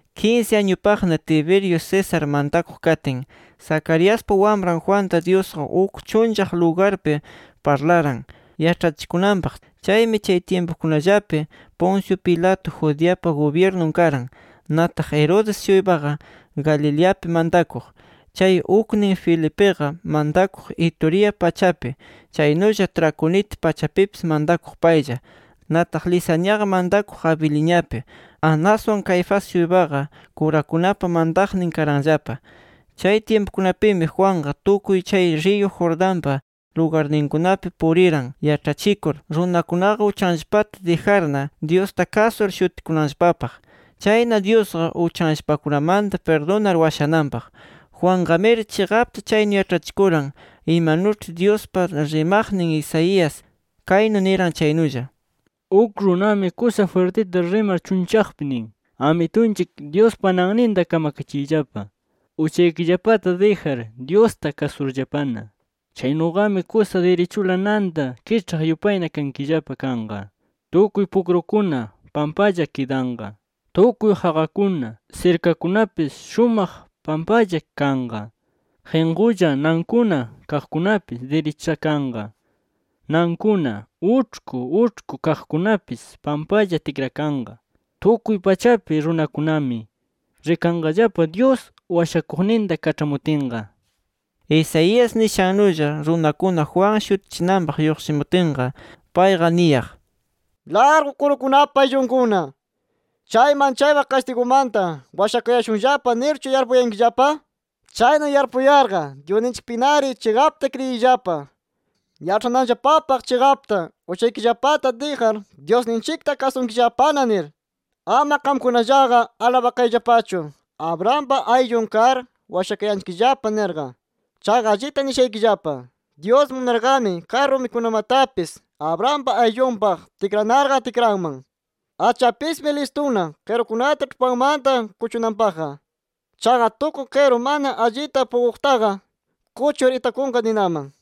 Kinsi añupaqna Tiberio César mantakuq katin, Zacariaspa wamran Juanta, Dyusqa uk chunllaq lugarpi parlaran yaĉhachikunanpaq. Chaymi chay tyimpukunallapi Poncio Pilato Judeapa gubyirnun karan. Nataq Herodes-shuypaqa Galileapi mantakuq. Chay uknin Felipiqa mantakuq Iturea pachapi, chaynulla Traconite pachapipis mantakuq paylla. Nataq Lisaniaqa mantakuq Abiliniapi. Anaswan Caifás-shuypaqa kurakunapa mantaqnin karanllapa. Chay tyimpukunapimi Juanqa tukuy chay riyu Jordanpa lugarninkunapi puriran yaĉhachikur, runakunaqa uchanllapata dijarna, Dyusta kasur shutikunanllapapaq. Chayna, Dyusqa uchanllapakunamanta pirdunar washananpaq. Juanqamiri chiqapta chaynu yaĉhachikuran, imanuĉhi Dyuspa rimaqnin Isaías kaynu niran chaynulla: “Uk runami kusa jwirtita rimar chunllaqpi nin: ‘Amitunchik Dyuspa nanninta kamakachiyllapa, uchaykillapata dijar Dyusta kasurllapana. Chaynuqami kusa dirichula nanta kiĉhaq yupayna kankillapa kanqa. Tukuy pukrukuna pampalla kidanqa. Tukuy qaqakuna, sirkakunapis shumaq pampalla kanqa. Qinqulla nankuna kaqkunapis dirichakanqa. Nankuna uĉhku uĉhku kaqkunapis pampalla tikrakanqa. Tukuy pachapi runakunami rikanqallapa Dyus Washakuqninta kaĉhamutinqa’”. Isaías nishannulla runakuna Juan shutichinanpaq lluqshimutinqa, payqa niyaq: “¡Largu kurukunapa ayllunkuna! ¿Chay manchaypaq kastigumanta washakayashunllapa nirchu yarpuyankillapa? Chaynu yarpuyarqa Dyusninchikpinari chiqapta kriyiyllapa, yaĉhananllapapaq chiqapta uchaykillapata dijar, Dyusninchikta kasunkillapana nir. Ama qamkunallaqa alabakayllapachu ‘Abrahampa ayllun kar washakayanchikllapa’ nirqa. Chaqa allita nishaykillapa: Dyus munarqami kay rumikunamatapis, Abrahampa ayllunpaq tikranarqa, tikranman. Achapismi listuna qirukunata ĉhupanmanta kuchunanpaqqa. Chaqa tukuy qiru mana allita puquqtaqa, kuchur itakunqa ninaman”.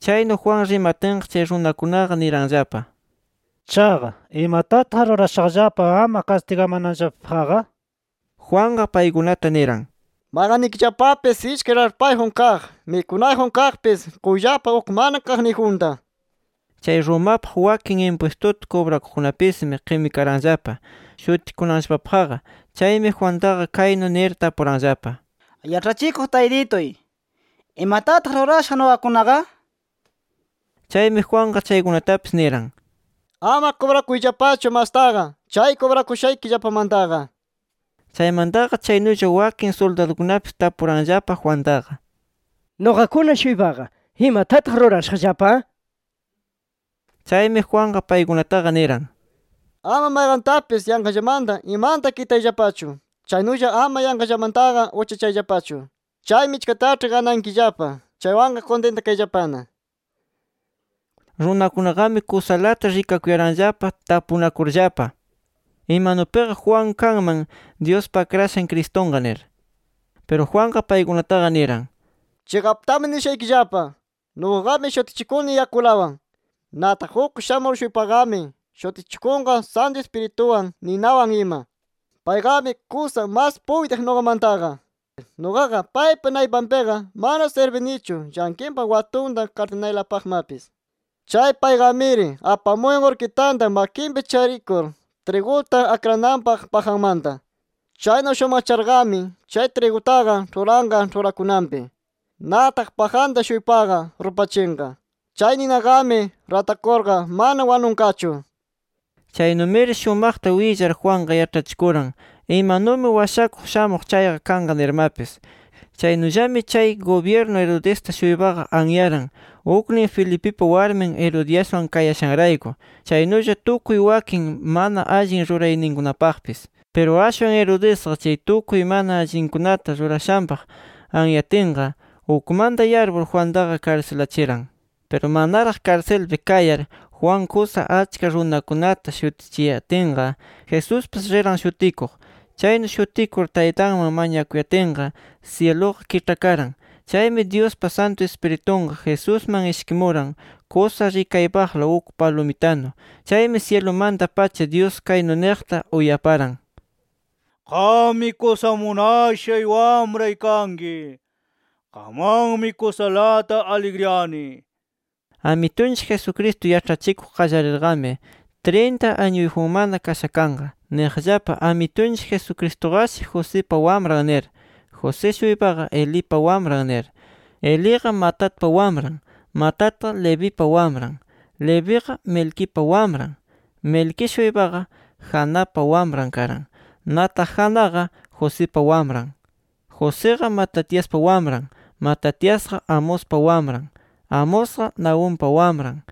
Chaynu Juan rimatinqa, chay runakunaqa niranllapa: — Chaqa, ¿imatataq rurashaqllapa ama kastigamananllapapaqqa? Juanqa paykunata niran: — Mayqannikillapapis ishkay raĉhpayjun kaq, mikunayjun kaqpis, quyllapa uk mana kaqniyjunta. Chay Romapaq wakin impwistuta kubrakuqkunapismi qimikaranllapa, shutikunanllapapaqqa. Chaymi Juantaqa kaynu nir tapuranllapa: —Yaĉhachikuq Taytituy, ¿imatataq rurashaq nuqakunaqa? Chaymi Juanqa chaykunatapis niran: —Ama kubrakuyllapachu mastaqa, chay kubrakushaykillapamantaqa. Chaymantaqa chaynulla wakin suldadukunapis tapuranllapa Juantaqa: —Nuqakuna-shuypaqa, ¿imatataq rurashaqllapa? nir. Chaymi Juanqa paykunataqa niran: —Ama mayqantapis yanqallamanta imanta kitayllapachu. Chaynulla ama yanqallamantaqa uchachayllapachu. Chay michkataĉhi ganankillapa chaywanqa kuntintakayllapana. Runakunaqami kusalata rikakuyaranllapa tapunakurllapa, imanupiqa Juan kanman Dyuspa Akrashan Cristunqa nir. Piru Juanqa paykunataqa niran: “Chiqaptami nishaykillapa: Nuqaqami shutichikuni yakulawan. Nataq uk shamur-shuypaqami shutichikunqa Santu Ispirituwan, ninawan ima. Payqami kusa mas puytiq nuqamantaqa. Nuqaqa paypa naypanpiqa mana sirbinichu llanqinpa watunta kaĉhanaypaqlamapis. Chay payqamiri apamuyan urkitanta makinpi charikur triguta akrananpaq pajanmanta. Chaynu shumaqcharqami chay trigutaqa ĉhuranqa ĉhurakunanpi. Nataq pajanta-shuypaqa rupachinqa. Chay ninaqami ratakurqa mana wanunqachu”. Chaynumiri shumaqta willar, Juanqa yaĉhachikuran imanumi Washakuq shamuq chayqa kanqa nirmapis. Chaynullami chay gubyirnu Herodesta-shuypaqa anyaran, uknin Felipipa warmin Herodiaswan kayashanrayku, chaynulla tukuy wakin mana allin rurayninkunapaqpis. Piru ashwan Herodesqa, chay tukuy mana allinkunata rurashanpaq anyatinqa, ukmanta yarpur Juantaqa karsilachiran. Piru manaraq karsilpi kayar Juan kusa achka runakunata shutichiyatinqa, Jesuspis riran shutikuq. Chaynu shutikur Taytanman mañakuyatinqa syiluqa kiĉhakaran. Chaymi Dyuspa Santu Ispiritunqa Jesusman ishkimuran kusa rikaypaqla, uk palumitanu. Chaymi syilumanta-pacha Dyus kaynu niqta uyaparan: “Qammi kusa munashay Wamray kanki. Qamwanmi kusalata aligriyani” nir. Amitunchik Jesucristo yaĉhachikuq qallarirqami trinta añuyjunmana kasha kanqa. Niqllapa Amitunchik Jesucristuqashi Josipa wamran nir. José-shuypaqa, Elipa wamran nir. Eliqa, Matatpa wamran. Matatqa, Levipa wamran. Leviqa, Melquipa wamran. Melquí-shuypaqa, Janapa wamran karan. Nataq Janaqa, Josipa wamran. Josiqa, Matatiaspa wamran. Matatiasqa, Amospa wamran. Amosqa, Nahumpa wamran.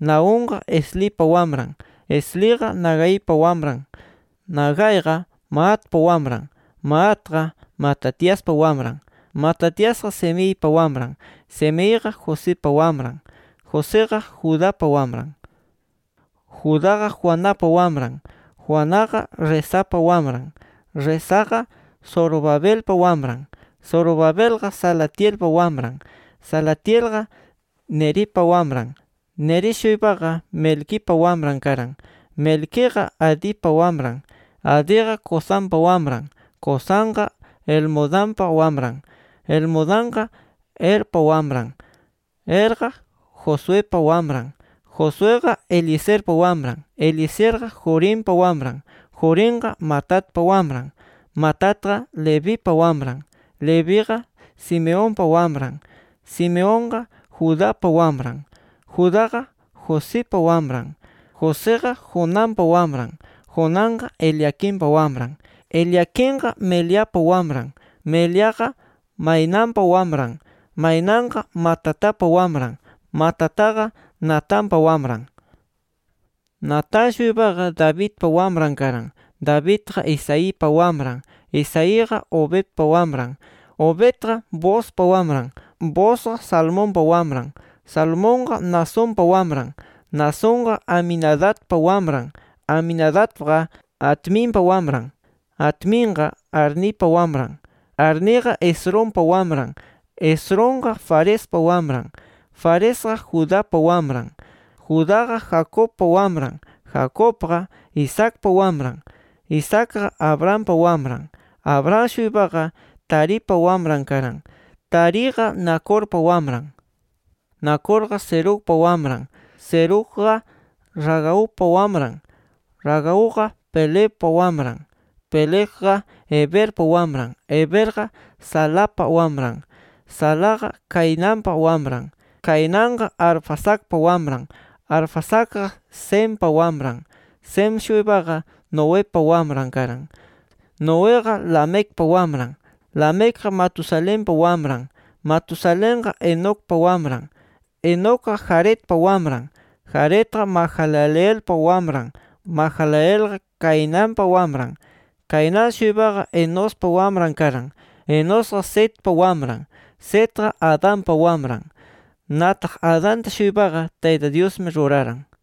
Nahumqa, Eslipa wamran. Esliqa, Nagaipa wamran. Nagaiqa, Maatpa wamran. Maatqa, Matatiaspa wamran. Matatiasqa, Semeipa wamran. Semeiqa, Josipa wamran. Josiqa, Judapa wamran. Judaqa, Joanapa wamran. Joanaqa, Resapa wamran. Resaqa, Zorobabelpa wamran. Zorobabelqa, Salatielpa wamran. Salatielqa, Neripa wamran. Neri-shuypaqa, Melquipa wamran karan. Melquiqa, Adipa wamran. Adiqa, Cosampa wamran. Cosamqa, Elmodampa wamran. Elmodamqa, Erpa wamran. Erqa, Josuepa wamran. Josueqa, Eliezerpa wamran. Eliezerqa, Jorimpa wamran. Jorimqa, Matatpa wamran. Matatqa, Levipa wamran. Leviqa, Simeonpa wamran. Simeonqa, Judapa wamran. Judaqa, Josipa wamran. Josiqa, Jonanpa wamran. Jonanqa, Eliaquimpa wamran. Eliaquimqa, Meleapa wamran. Meleaqa, Mainanpa wamran. Mainanqa, Matatapa wamran. Matataqa, Natanpa wamran. Natán-shuypaqa, Davidpa wamran karan. Davidqa, Isaipa wamran. Isaiqa, Obedpa wamran. Obedqa, Boozpa wamran. Boozqa, Salmonpa wamran. Salmonqa, Naasonpa wamran. Naasonqa, Aminadabpa wamran. Aminadabqa, Adminpa wamran. Adminqa, Arnipa wamran. Arniqa, Esrompa wamran. Esromqa, Farespa wamran. Faresqa, Judapa wamran. Judaqa, Jacobpa wamran. Jacobqa, Isaacpa wamran. Isaacqa, Abrahampa wamran. Abraham-shuypaqa, Taripa wamran karan. Tariqa, Nacorpa wamran. Nacorqa Serugpa wamran. Serugqa, Ragaupa wamran. Ragauqa, Pelegpa wamran. Pelegqa, Heberpa wamran. Heberqa, Salapa wamran. Salaqa Cainanpa wamran. Cainanqa, Arfaxadpa wamran. Arfaxadqa, Sempa wamran. Sem-shuypaqa, Noepa wamran karan. Noeqa, Lamecpa wamran. Lamecqa, Matusalenpa wamran. Matusalenqa, Enocpa wamran. Enocqa, Jaredpa wamran. Jaredqa, Mahalaleelpa wamran. Mahalaleelqa, Cainanpa wamran. Cainán-shuypaqa, Enospa wamran karan. Enosqa, Setpa wamran. Setqa, Adanpa wamran. Nataq Adanta-shuypaqa Tayta Dyusmi ruraran.